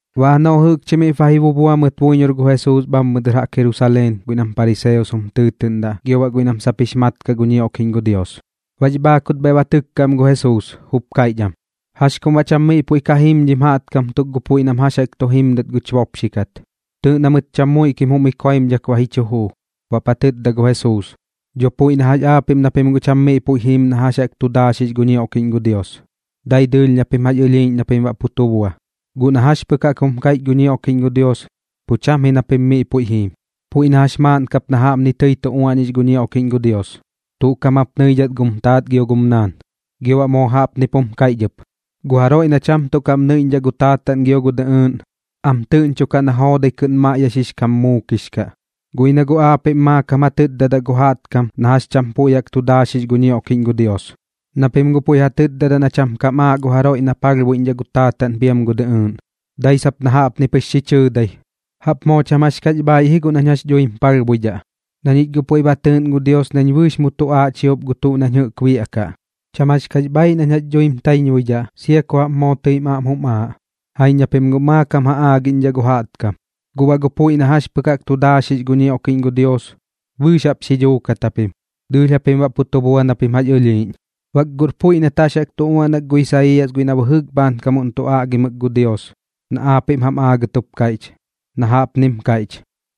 Baꞌ janoꞌ jɨꞌkchi miꞌp ba ji bubua mɨt buiñor gu Jesuus bhammɨ dɨr jaꞌk Jerusaleen guiꞌ nam pariseos jum tɨɨtɨꞌndaꞌ gio baꞌ guiꞌ nam sap jix mat kaꞌ gu ñioꞌkiꞌñ gu Dios, baꞌx bhaakut bhaiꞌ ba tɨkka am gu Jesuus, jup kaiꞌch am: ―¿Jax kum baꞌ cham miꞌ puiꞌ ka jiim dhim jaꞌtkam tuk gu puiꞌ nam jax jaꞌk tu jimdat guch bopxi kat? Tɨɨꞌ na mɨt cham muiꞌ kim jum ikoimdhak ba ji chu juu. Baꞌp ja tɨtda gu Jesuus: ―Dho puiꞌ na jax aapiꞌm na pim guꞌ cham miꞌ puiꞌ jiim na jax jaꞌk tu daaxix gu ñioꞌkiꞌñ gu Dios, dai dɨɨlh na pim jax ɨlhiiꞌñ na pim baꞌ pu tu bua. Guꞌ na jax pɨk jaꞌk jum kaiꞌch gu ñioꞌkiꞌñ gu Dios, pu cham ji na pim miꞌ puiꞌ jiim. Puiꞌ na jax maaꞌn kap na jaꞌpni tɨi tu uaꞌñix gu ñioꞌkiꞌñ gu Dios: “Tuꞌ kaꞌm jap nɨidhat gum taat gio gum naan.” Gio baꞌ moo jaꞌpnip jum kaiꞌch ɨp: “Gu jaroiꞌ na cham tuꞌ kaꞌm nɨiꞌñdhaꞌ gu taataꞌn gio gu dɨꞌɨɨꞌn, am tɨꞌñchokaꞌ na joodai kɨꞌn maiꞌyaxix kam muukix kaꞌ.” Guꞌ ji na pim guꞌ aapiꞌm maakam ja tɨtdadaꞌ gu jaꞌtkam na jax cham puiꞌ jaꞌk tu daaxix gu ñioꞌkiꞌñ gu Dios, na pim puiꞌ ja tɨtdadaꞌ na cham kam aaꞌ gu jaroiꞌ na palhbuiꞌñdhaꞌ gu taataꞌn piam gu dɨꞌɨɨꞌn, dai sap na jaꞌpni pɨx xi chɨɨdai: “Jaꞌp moo cham jax kax bhaaiꞌ ji guꞌ nañ jax dhuim palhbuidhaꞌ, na ñich guꞌ puiꞌ ba tɨɨꞌn gu Dios nañ bɨɨx mu tuꞌaaꞌ chiop gu tuꞌ nañ jɨꞌk biaꞌkaꞌ. Cham jax kax bhaaiꞌ nañ jax dhuim taiñbuidhaꞌ, sia ku jaꞌp moo tɨim aꞌm jum aaꞌ.” Jaiñ na pim guꞌ maakam ja aagiꞌñdhaꞌ gu jaꞌtkam, guꞌ baꞌ gu puiꞌ na jax pɨk jaꞌk tu daaxix gu ñioꞌkiꞌñ gu Dios, bɨɨx jaꞌp xi dhuukat japim, dɨɨlh japim baꞌ pu tu bua na pim jax ɨlhiiꞌñ. Bak guꞌr puiꞌ nat jax jaꞌk tu uaꞌnak gu Isaiiyas guiꞌ na bɨjɨk bhaankam tu aꞌgimɨk gu Dios na aapiꞌm jam aagɨt jup kaiꞌch, na jaꞌpnim kaiꞌch: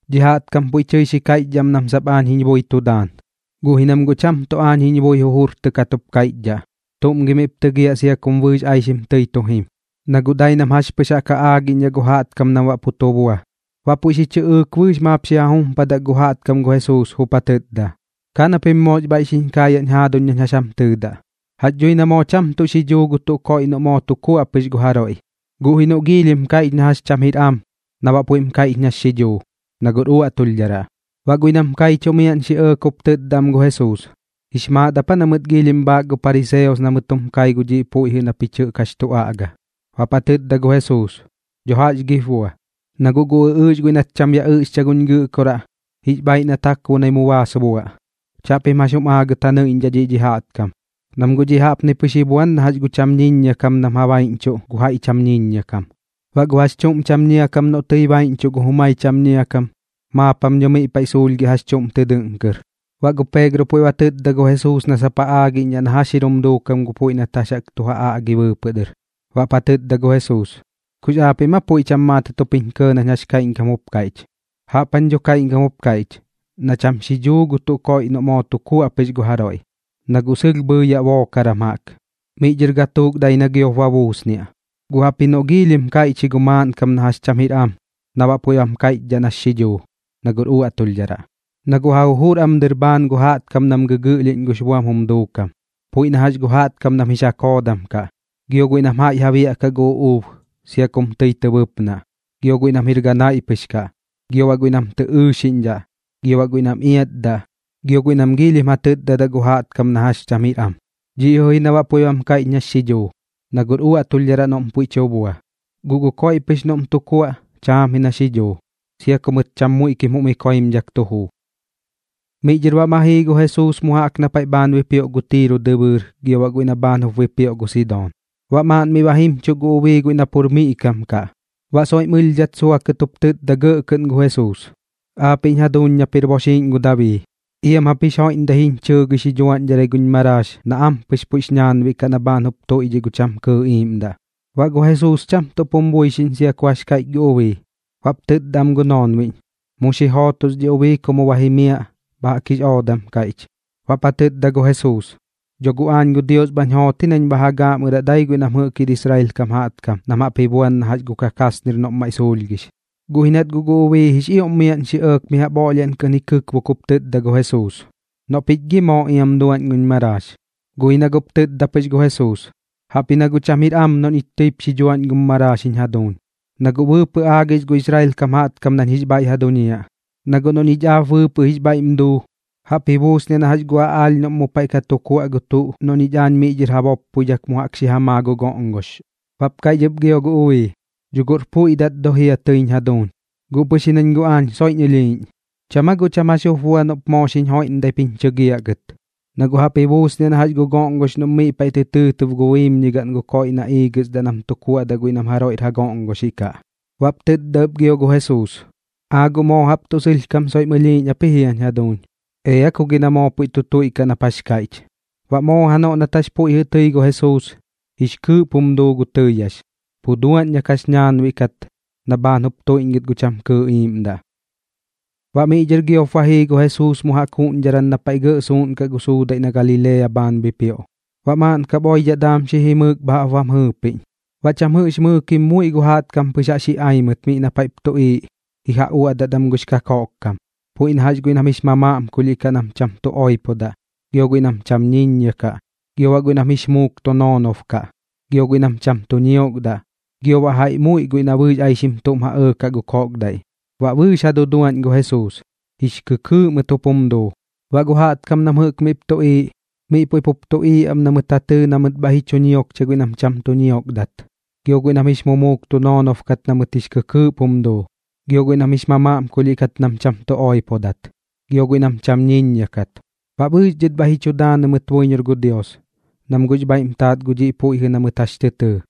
Dhi jaꞌtkam puiꞌ tɨi xi kaiꞌchdhaꞌ am nam sap aañ jiñ bui tu daan, guꞌ ji nam guꞌ cham tuꞌ aañ jiñ bui jujurtɨkat jup kaiꞌchdhaꞌ. ¿Tuꞌm gi miꞌp tɨgiaꞌ sia kum bɨɨx aixim tɨi tu jim? Na guꞌ dai nam jax pɨx jaꞌk ja aagiꞌñdhaꞌ gu jaꞌtkam nam baꞌ pu tu bua. Baꞌ puiꞌ xi chɨꞌɨɨk bɨɨx maap xi ja jumpadak gu jaꞌtkam gu Jesuus, jup ja tɨtda: ―Ka na pim moox bhaiꞌ xiñ kaayaꞌñ jaaduñ nañ jax jam tɨɨdaꞌ. Jax dhui na moo cham tuꞌ xidhuu gu tuꞌ koiꞌ noꞌ moo tu kuaꞌ pɨx gu jaroiꞌ. Guꞌ ji noꞌ giilhim kaiꞌch na jax cham jir am na baꞌ puiꞌm kaiꞌch nax xidhuu, na guꞌr uaꞌtulhdharaꞌ. Baꞌ guiꞌ nam jɨꞌk kaichuꞌ miaꞌn xi ɇɇk jup tɨtda am gu Jesuus: ―¿Jix maat ap aa na mɨt giilhim bhaak gu pariseos na mɨt jum kai gu dhiꞌ puiꞌ jɨꞌ na pich jax tu aꞌga? Baꞌp ja tɨtda gu Jesuus: ―¿Dho jax gip bua? Na guꞌ gu ɨꞌɨɨx guiꞌ nat cham ya ɨꞌxcha guñ Gɨꞌkoraꞌ, jix bhaaiꞌ na takbonai mu baas buaꞌ. Chaꞌpim jax jum aagɨt ja nɨiꞌñdhaꞌ dhiꞌ dhi jaꞌtkam, nam guꞌ dhiꞌ jaꞌp pɨx ji buan na jax gu cham ñiññia kam nam ja baiꞌñchuꞌ gu jaiꞌ cham ñiññia kam. Baꞌ gu jax chuꞌm cham ñia kam noꞌ tɨi baiꞌñchuꞌ gu jumai cham ñia kam, maap jam dho miꞌ paiꞌ suulhgiaꞌ jax chuꞌm tɨ dɨꞌn kɨr. Baꞌ gu Peegro puiꞌ ba tɨtda gu Jesuus na sap ja aagiꞌñdhaꞌ na jax jir jum duukam gu puiꞌ nat jax jaꞌk tu ja aꞌgi bɨɨpɨꞌ dɨr. Baꞌp ja tɨtda gu Jesuus: ―¿Kux aapiꞌm aa puiꞌ cham maatɨt jup jiñ kɇɇ nañ jax kaiꞌñkam jup kaiꞌch? Jaꞌp jañ dho kaiꞌñkam jup kaiꞌch: Na cham xidhuu gu tuꞌ koiꞌ noꞌ moo tu kuaꞌ pɨx gu jaroiꞌ, na guꞌ sɨlh bhɨɨyaꞌ bookaran jaꞌk, miꞌ dhɨr gatuuk dai na giop ba buusniaꞌ. Guꞌ jaꞌpji noꞌ giilhim kaiꞌch ji gu maaꞌnkam na jax cham jir am na baꞌ puiꞌm kaiꞌch nax xidhuu, na guꞌr uaꞌtulhdharaꞌ. Na guꞌ ja jujur am dɨr bhaan gu jaꞌtkam nam gɨgɨꞌlhiꞌñ gux buam jum duukam, puiꞌ na jax gu jaꞌtkam nam jix ja koodam kaꞌ, gio guiꞌ nam jaiꞌ ja biaꞌkaꞌ gu uꞌuub sia kum tɨi tɨ bɨpnaꞌ, gio guiꞌ nam jir ganaiꞌ pɨx kaꞌ, gio baꞌ guiꞌ nam tɨ ɨɨxiꞌñdhaꞌ, gio baꞌ guiꞌ nam iatdaꞌ, gio guiꞌ nam giilhim ja tɨtdadaꞌ gu jaꞌtkam na jax cham jir am. Dhiꞌ jɨꞌ na baꞌ puiꞌm kaiꞌch nax xidhuu, na guꞌr uaꞌtulhdharaꞌ noꞌm pu tu bua. Guꞌ gu koiꞌ pɨx noꞌm tu kuaꞌ, chaam ji nax xidhuu, sia ku mɨt cham muiꞌ kim jum ikoimdhak tu juu. Miꞌ dhɨr baꞌ ma jii gu Jesuus mu jaꞌk na paiꞌ bhaan bipioꞌ gu Tiiro dɨbɨɨr gio baꞌ guiꞌ na bhaan jup bipioꞌ gu Sidoon. Baꞌ maaꞌn miꞌ ba jimchuꞌ gu ubii guiꞌ na pur miꞌ kam kaꞌ, baꞌ soiꞌm ɨlhdhat suakɨt jup tɨtda gɇꞌ kɨꞌn gu Jesuus: ―Aapiꞌñ jaduuñ nap jir boxiiꞌñ gu Dabii, iam jap jix joiꞌmdai xiñ chɨɨgɨi xi dhuaꞌñdharai guñ maraax na ampɨx puiꞌx ñaanbiꞌ kaꞌ na bhaan jup tuꞌiiꞌ gu cham kɨɨꞌ iiꞌmdaꞌ. Baꞌ gu Jesuus cham tuꞌp jum buixiꞌñ sia ku jax kaiꞌch gu ubii. Baꞌp tɨtda am gu noonbiꞌñ: ―Mu xi jootos dhi ubii ku mu ba jimiaꞌ. Bha jaꞌk jix oodam kaiꞌch. Baꞌp ja tɨtda gu Jesuus: ―Dho guꞌ aañ gu Dios bhañ joot ji nañ bha ja gaaꞌmɨraꞌ dai guiꞌ nam jɨꞌk jir Israel kam jaꞌtkam nam jaꞌp ji buan na jax gu kakasnir noꞌm maiꞌ suulhgix. Guꞌ ji nat guꞌ gu ubii jix ioꞌm miaꞌn xi ɇɇk mi jaꞌp oꞌlhiaꞌn kɨꞌn xi kɨkbok jup tɨtda gu Jesuus: ―Noꞌ pich gi moo iam duaꞌñ guñ maraax. Guꞌ ji na guꞌp tɨtda pɨx gu Jesuus: ―Jaꞌpji na guꞌ cham jir am noꞌ ñich tɨip xi dhuaꞌñ gum maraax jiñ jaduuñ, na guꞌ bɨɨpɨꞌ aagix gu Israel kam jaꞌtkam nañ jix bhaiꞌ ja duñiaꞌ. Na guꞌ noꞌ ñich aap bɨɨpɨꞌ jix bhaiꞌm duu, jaꞌp ji buusniaꞌ na jax gu aꞌaalh noꞌm mu paiꞌ ka tu kuaꞌ gu tuꞌ noꞌ ñich miꞌ dhɨr ja boppoidhak mu jaꞌk xi ja maa gu goꞌngox. Baꞌp kaiꞌch ɨp gio gu ubii: ―Dho guꞌr puiꞌ dat dho jia tɨiñ jaduuñ, guꞌ pɨx ji nañ guꞌ aañ soiꞌñ ɨlhiiꞌñ. ¿Cham aa guꞌ cham jax jup bua noꞌp moo xiñ joiꞌmdaip jiñ chɨgiaꞌ gɨt? Na guꞌ jaꞌp ji buusniaꞌ na jax gu goꞌngox noꞌm miꞌ paiꞌ tɨ tɨɨtɨb gu biimñigaꞌn gu koiꞌ na iigɨsdaꞌ nam tu kuaꞌdaꞌ guiꞌ nam jaroiꞌr ja goꞌngoxiꞌ kaꞌ. Baꞌp tɨtda ɨp gio gu Jesuus: ―Aa guꞌ moo jaꞌp tuꞌ sɨlhkam soiꞌm ɨlhiiꞌñ ap ji jiañ jaduuñ. Ea ku gi na moo puiꞌ tu tuiꞌkaꞌ nap jax kaiꞌch. Baꞌ moo janoꞌ nat jax puiꞌ jɨꞌ tɨi gu Jesuus, jix kɨɨꞌp jum duu gu tɨɨyax, pu dua na kax ñaanbiꞌ kat na bhaan jup tuiꞌñgɨt gu cham kɨɨꞌ iiꞌmdaꞌ. Baꞌ miꞌ dhɨr giop ba jii gu Jesuus mu jaꞌk juꞌñdharan na paiꞌ gɇꞌ suuꞌnkaꞌ gu suudaiꞌ na Galilea bhaan bipioꞌ. Baꞌ maaꞌn kap oidhaꞌ daam xi jimɨɨk bha jaꞌp bam jɨɨpiꞌñ. Baꞌ cham jɨꞌx mɨɨkim muiꞌ gu jaꞌtkam pɨx jaꞌx ji ai mɨt miꞌ na paiꞌp tuꞌiiꞌ ji ja uaꞌdat am gux kakoꞌk kam, puiꞌ na jax guiꞌ nam jix mamaꞌmkulhiꞌ kaꞌ nam cham tu oipodaꞌ, gio guiꞌ nam cham ñiññia kaꞌ, gio baꞌ guiꞌ nam jix mumuuk tu noonob kaꞌ, gio guiꞌ nam cham tu ñiokdaꞌ, gio baꞌ jaiꞌ muiꞌ guiꞌ na bɨɨx aixim tuꞌm ja ɇɇkaꞌ gu koꞌkdaiꞌ. Baꞌ bɨɨx ja duduaꞌñ gu Jesuus, jix kɨkɨɨꞌ mɨt jup jum duu. Baꞌ gu jaꞌtkam nam jɨꞌk miꞌp tuꞌiiꞌ, miꞌ puiꞌ pup tuꞌiiꞌ am na mɨt ja tɨɨ na mɨt bhaiꞌ ji chu ñiokcha guiꞌ nam cham tu ñiokdat, gio guiꞌ nam jix muuk tu noonob kat na mɨt jix kɨkɨɨꞌp jum duu, gio guiꞌ nam jix mamaꞌmkulhiꞌ kat nam cham tu oipodat, gio guiꞌ nam cham ñiññia kat. Baꞌ bɨɨx dhɨt bhaiꞌ ji chu daanɨ mɨt buiñor gu Dios, nam guꞌx bhaiꞌm taat gu dhiꞌ puiꞌ jɨꞌ na mɨt jax tɨ tɨɨ.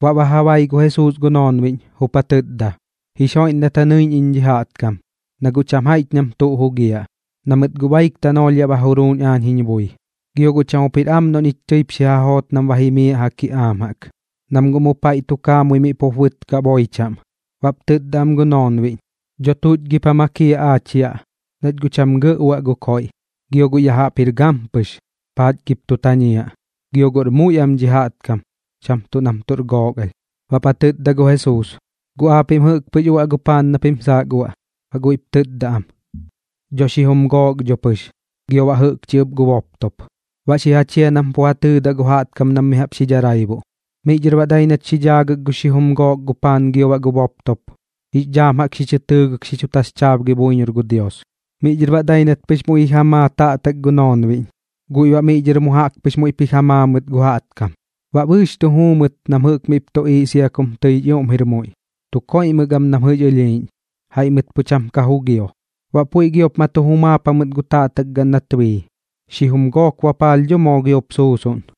Baꞌ ba ja bai gu Jesuus gu noonbiꞌñ, jup ja tɨtda: ―Jix joiꞌmdat ja nɨiꞌñ iñ dhi jaꞌtkam, na guꞌ cham jaiꞌch nam tuꞌ ka jugiaꞌ, na mɨt guꞌ baik tanoolh yaꞌ ba juruuñ aañ jiñ bui. Gio guꞌ cham jup jir am noꞌ ñich tɨip xi ja joot nam ba jimiaꞌ ja kiꞌaam jaꞌk, nam guꞌ mu paiꞌ tu kaamui miꞌ pup bɨtkaꞌ boi chaꞌm. Baꞌp tɨtda am gu noonbiꞌñ: ―¿Dho tuꞌch gip ja makiaꞌ aach yaꞌ, nach guꞌ cham gɇꞌ uaꞌ gu koiꞌ? Gio guꞌ ya jaꞌp jir gampɨx, ¿paach gip tu tañiaꞌ? Gio guꞌr muiꞌ am dhi jaꞌtkam, cham tuꞌ tuꞌr gook alh am. Baꞌp ja tɨtda gu Jesuus: ―¿Guꞌ aapiꞌm jɨꞌk pɨx uaꞌ gu paan na pim saak uaꞌ? Baꞌ guiꞌp tɨtda am: ―Dho xijum gook dho pɨx, gio baꞌ jɨꞌkchi ɨp gu boptop. Baꞌ xi ja chia nam pu ja tɨɨdaꞌ gu jaꞌtkam nam mi jaꞌp xi dharaibuꞌ. Miꞌ dhɨr baꞌ dai nat xi dhaagɨk gu xijum gook gu paan gio baꞌ gu boptop, jix dhaam jaꞌk xi chɨ tɨɨgɨk xi chu taxchaabgi buiñor gu Dios. Miꞌ dhɨr baꞌ dai nat pɨx muiꞌ ji ja maa taꞌtak gu noonbiꞌñ, guiꞌ baꞌ miꞌ dhɨr mu jaꞌk pɨx muiꞌp ji ja maa mɨt gu jaꞌtkam. Baꞌ bɨɨx tu juu mɨt nam jɨꞌk miꞌp tuꞌiiꞌ sia kum jix ioꞌm tɨir muiꞌ, tu koiꞌmɨk am nam jɨꞌx ɨlhiiꞌñ, jaiꞌ mɨt pu cham ka jugio. Baꞌ puiꞌ giop ma tu jumaap jamɨt gu taꞌtak gaꞌn nat bii, xijum gook bapaalh dho moo giop suusuꞌn.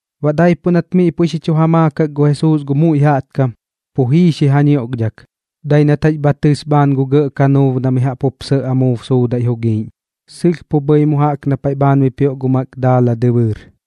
Baꞌ daipuꞌ nat miꞌ puiꞌ xi chu ja maakak gu Jesuus gu muiꞌ jaꞌtkam, pu jii xi ja ñioꞌkdhak, dai nat jax bha tɨs bhaan gu gɇꞌ kanuub na mi jaꞌp jup sɇꞌ amuub suudaiꞌ jugiiꞌñ, sɨlh bhɨi mu jaꞌk na paiꞌ bhaan bipioꞌ gu Magdaala dɨbɨɨr.